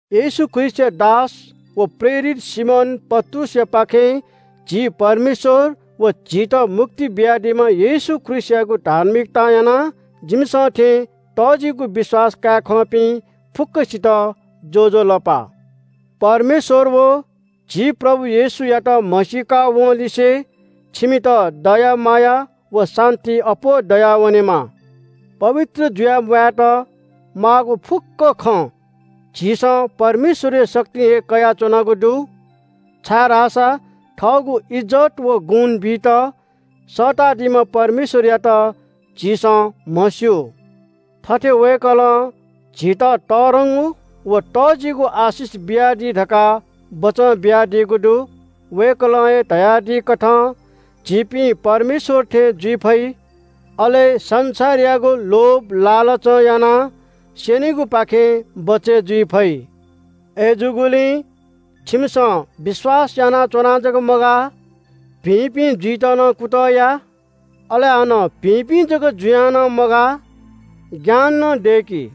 येशू ख्रीष्‍टया दास व प्रेरित सिमोन पत्रुसयापाखें झी परमेश्‍वर व झीत मुक्ति बियादीम्‍ह येशू ख्रीष्‍टयागु धार्मिकतां यानाः जिमिसं थें तःजिगु विश्‍वास काये खंपिं फुक्‍कसित ज्‍वजलपा। परमेश्‍वर व झी प्रभु येशूयात म्‍हसीका वंलिसे छिमित दया माया व शान्‍ति अप्‍वः दयावनेमा। पवित्र जुयाः म्‍वायेत माःगु फुक्‍क खँ झीसं परमेश्‍वरया शक्तिं हे कयाच्‍वनागु दु, छाय्‌धाःसा थःगु इज्‍जत व गुण बीत सःतादीम्‍ह परमेश्‍वरयात झीसं म्‍हस्‍यू। थथे वय्‌कलं झीत तःधंगु व तःजिगु आशिष बियादी धकाः बचं बियादीगु दु। वय्‌कलं हे धयादीकथं झीपिं परमेश्‍वर थें जुइ फइ, अले संसारयागु लोभ लालचं यानाः स्‍यनीगुपाखें बचय् जुइ फइ। अय्‌जूगुलिं छिमिसं विश्‍वास यानाच्‍वनाः जक मगाः, भिंपिं जुइत नं कुतः या। अले हानं भिंपिं जक जुयां नं मगाः, ज्ञान नं दय्‌कि।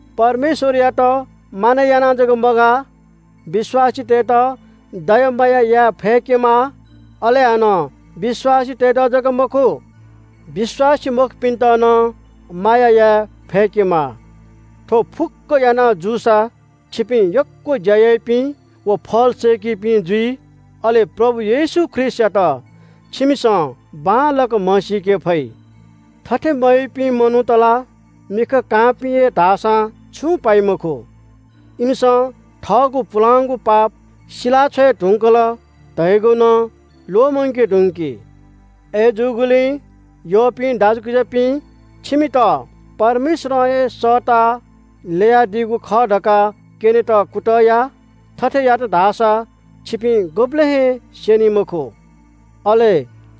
परमेश्‍वरयात मानय् यानाः जक मगाः, विश्‍वासीतय्‌त दया माया याये फय्‌केमाः। अले हानं विश्‍वासीतय्‌त जक मखु, विश्‍वासी मखुपिन्‍त नं माया याये फय्‌केमाः। थ्‍व फुक्‍क याना जूसा छिपिं यक्‍व ज्‍या याइपिं व फल सय्‌कीपिं जुइ। अले प्रभु येशू ख्रीष्‍टयात छिमिसं बांलाक म्‍हसीके फइ। थथे मयाइपिं मनूत ला मिखा कांपिं हे धाःसां छुं पाइ मखु। इमिसं थःगु पुलांगु पाप सिलाछ्वये धुंकल धयागु नं ल्‍वःमंके धुंकी। अय्‌जूगुलिं यःपिं दाजुकिजापिं, छिमित परमेश्‍वरं हे सःताः ल्‍ययादीगु खः धकाः क्‍यनेत कुतः या। थथे यात धाःसा छिपिं गुबलें हे क्‍वदली मखु। अले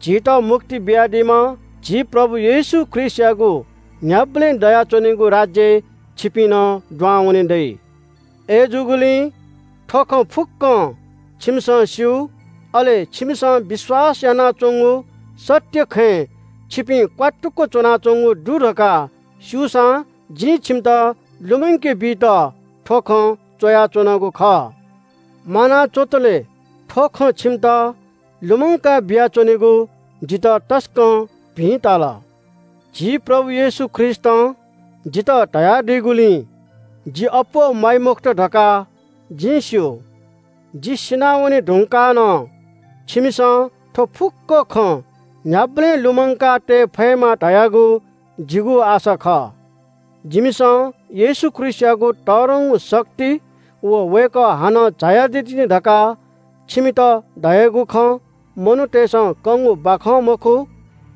झीत मुक्ति बियादीम्‍ह झी प्रभु येशू ख्रीष्‍टयागु न्‍ह्याबलें दयाच्‍वनीगु राज्‍यय् छिपिं नं दुहां वने दइ। अय्‌जूगुलिं थ्‍व खँ फुक्‍कं छिमिसं स्‍यू, अले छिमिसं विश्‍वास यानाच्‍वंगु सत्‍य खँय् छिपिं क्‍वात्तुक च्‍वनाच्‍वंगु दु धकाः स्‍यूसां जिं छिमित लुमंके बीत थ्‍व खँ च्‍वयाच्‍वनागु खः। म्‍वाना च्‍वंतले थ्‍व खँ छिमित लुमंका बियाच्‍वनेगु जितः तसकं भिं ताल। झी प्रभु येशू ख्रीष्‍टं जितः धयादीगुलिं जि अप्‍वः म्‍वाइ मखुत धकाः जिं स्‍यू। जि सिनावने धुंकाः नं छिमिसं थ्‍व फुक्‍क खँ न्‍ह्याबलें लुमंकातये फयेमा धयागु जिगु आशा खः। जिमिसं येशू ख्रीष्‍टयागु तःधंगु शक्ति व वय्‌कः हानं झायादी तिनि धकाः छिमित धयागु खँ मनूतय्‌सं कंगु बाखं मखु।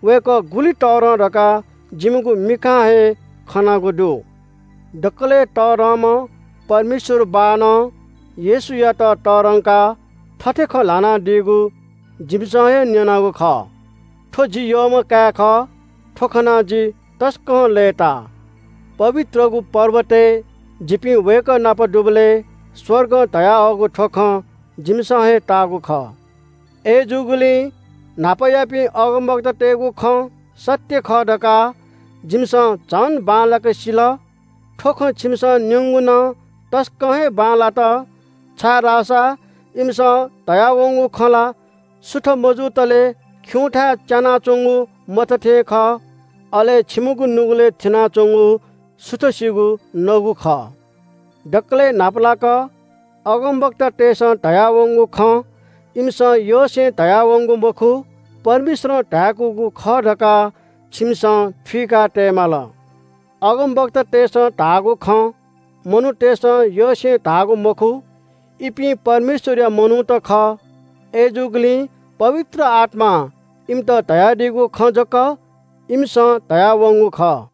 वय्‌कः गुलि तःधं धकाः जिमिगु मिखां हे खनागु दु। दकलय् तःधंम्‍ह परमेश्‍वर बाःनं येशूयात तःधंकाः थथे खँ ल्‍हानादीगु जिमिसं हे न्‍यनागु खः – “थ्‍व जि यःम्‍ह काय् खः। थ्‍व खनाः जि तसकं लय्‌ता।” पवित्रगु पर्वतय् जिपिं वय्‌कः नाप दुबलय् स्‍वर्गं धयाहःगु थ्‍व खँ जिमिसं हे ताःगु खः। अय्‌जूगुलिं न्‍हापायापिं अगमवक्तातय्‌गु खँ सत्‍य खः धकाः जिमिसं झन बांलाक सिल। थ्‍व खँ छिमिसं न्‍यंगु नं तसकं हे बांलात, छाय्‌धाःसा इमिसं धयावंगु खँ ला सुथ मजुतले खिउँथाय् च्‍यानाच्‍वंगु मत थें खः। अले छिमिगु नुगलय् थिनाच्‍वंगु सुथसिगु नगु खः। दकलय् न्‍हापालाक अगमवक्तातय्‌सं धयावंगु खँ इमिसं यसें धयावंगु मखु, परमेश्‍वरं धाय्‌कूगु खः धकाः छिमिसं थुइका तये माल। अगमवक्तातय्‌सं धाःगु खँ मनूतय्‌सं यसें धाःगु मखु। इपिं परमेश्‍वरया मनूत खः। अय्‌जूगुलिं पवित्र आत्‍मां इमित धयादीगु खँ जक इमिसं धयावंगु खः।